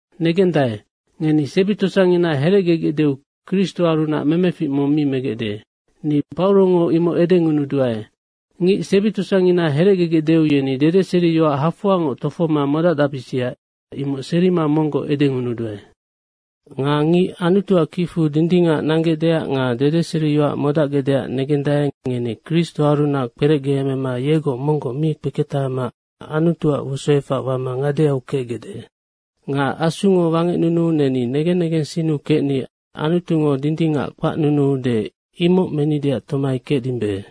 Negendae, ngeni sebi tosangina herecgegecdeu Kristoarunac memefic mong mi megecde, ni Paurongo imoc edengunuduae. Ngic sebi tosangina herecgegecdeu yeni dedeseriyoac hafoangoc tofohoma modacdacbisia, imoc serima monggoc edengunuduae. Nga ngic Anutuac kicfu dindingac nanggecdeac dedeseriyoac modacgecdeac negendae, ngeni Kristoarunac kperecgeemema yegoc monggoc mi kpeketahama Anutuac wosoefac wama ngadeau kecgecde. Nga Asungo wangecnunuu neni negen negensinnu kecni Anutungo dindingac kpacnunuude, imoc menideac tomai kecdimbe.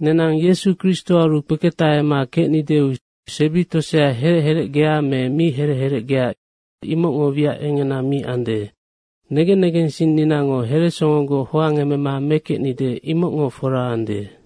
Nenang Yesu Kristoaru kpeketahama kecnideu sebi tosea herec herecgea me mi herec herecgea, imocngo wiac engena mi ande. Negen negensinninango heresongogoc hoangemema mekecnide, imocngo fora ande.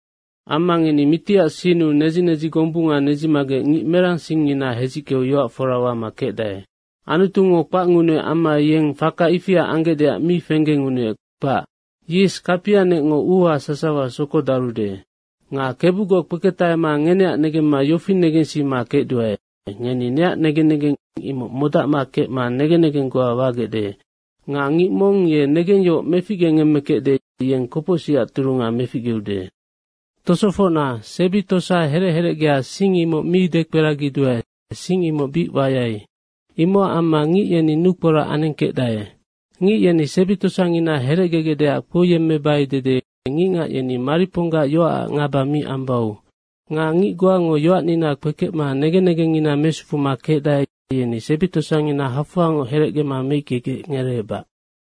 Amma ngeni mitiac sinnu nedzi nedzi gombunga nedzimagec ngic merang singngina hedzickeu yoac fora wama kecdae. Anutungo kpacngunuec amma yeng faka ifia anggecdeac mi fenggengunuec, kpac. Yis kapianecngo uuha sasawa sokodarude. Nga Kebugoc kpeketahema ngeneac negemma yofi negensima kecduae, ngeni neac negen negeng imoc modacma kecma negen negeng goa wagecde. Nga ngic mong ye negengyohoc meficgengemmekecde, yeng kopocsicac turunga meficgeude. Tosofocna, sebi tosa herec herecgea sing imoc mi dekperagiduae, sing imoc bic wayai. Imocac amma ngic yeni nukporac anengkecdae. Ngic yeni sebi tosangina herecgegecdeac kpouyemmebai dede ngicngac yeni mariponggac yoacac ngaba mi ambau. Nga ngic goango yoacnina kpekecma negen negengngina mesufuma kecdae, yeni sebi tosangina hafoangoc herecgema meickegec ngereebac.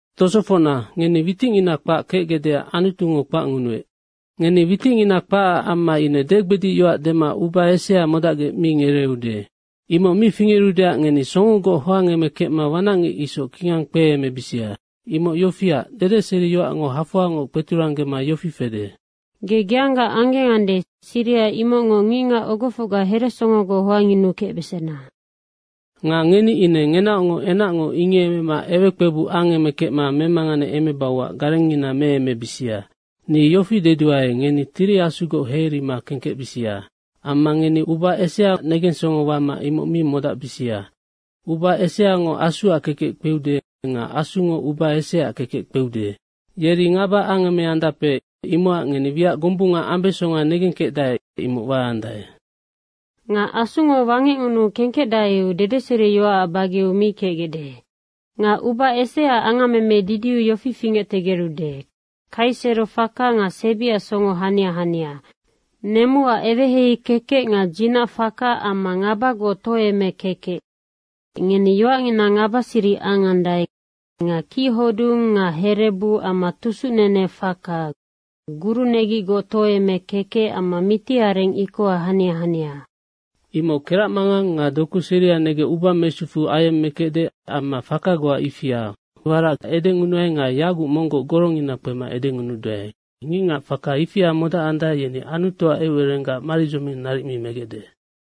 Tosofocna, ngeni witicngina kpac kecgecdeac Anutungo kpacngunuec. Ngeni witicngina kpacac amma ine degbedic yoac dema uba esea modacgec mi ngereeude. Imoc mi fingerudeac ngeni songogoc hoangemekecma wanacngic isoc kingang kpeemebisia. Imoc yofiac, dedeseriyoacngo hafoangoc kpeturanggema yofi fede, “Ge geangga anggengande, siriha imocngoc ngicngac ogofocga heresongogoc hoangyunukecbesena.” Nga ngeni ine ngenaocngoc enacngo ingiemema ewekpebuc angemekecma memanganeemebauac garengngina meemebisia. Ni yofi deduae, ngeni Tiri Asugoc heirima kengkecbisia. Amma ngeni uba eseaac negensongo wama imoc mi modacbisia. Uba eseango Asuac kekec kpeude nga Asungo uba eseaac kekec kpeude. Yeri ngaba angemeandape, imocac ngeni wiac gombunga ambesonga negengkecdae, imoc waandae. Nga Asungo wangecngunuu kengkecdaeu dedeseriyoacac bageu mi kecgecde. Nga uba eseaac angammeme didiu yofi fingectegerude, Kaisero faka nga sebiac songo hania hania. Nemuac eweheihei kekec nga dzinac faka amma ngabagoc tohoeme kekec, ngeni yoacngina ngabasiric angandae nga kichodung nga herebu amma tusucnene faka, gurunegicgoc tohoeme kekec amma mitiareng ikoha hania hania. Imoc keracmangang nga doku seria negec uba mesufu ayemmekecde amma faka goa ifia. Warac edengunuai nga yaguc monggoc gorongina kpema edengunuduae, ngicngac faka ifia modacandae, yeni Anutuac eucererenggac maridzoming naric mi megecde.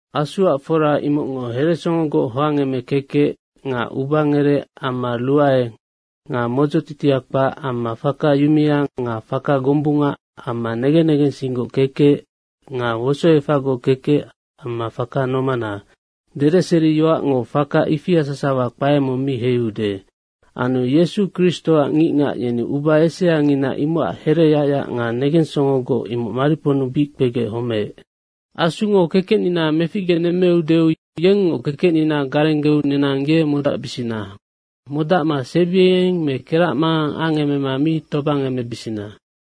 Asuac fora imocngo heresongogoc hoangemema kekec nga ubangerec amma ruae nga modzotitia kpac amma faka yumea nga faka gombunga amma negen negensinggoc kekec, nga wosoefacgoc kekec amma faka nomana. Dedeseriyoacngo faka ifia sasawa kpae mong mi heiude. Anu Yesu Kristoac ngicngac yeni uba eseangina imocac hereyacyac nga negensongogoc, imoc mariponnu bic kpegec homeec. Asungo kekecnina meficgenemmeudeu, yengngoc kekecnina garenggeu nenang ye modacbisina. Modacma sebiengeng me keracmangang angemema mi tobangemebisina.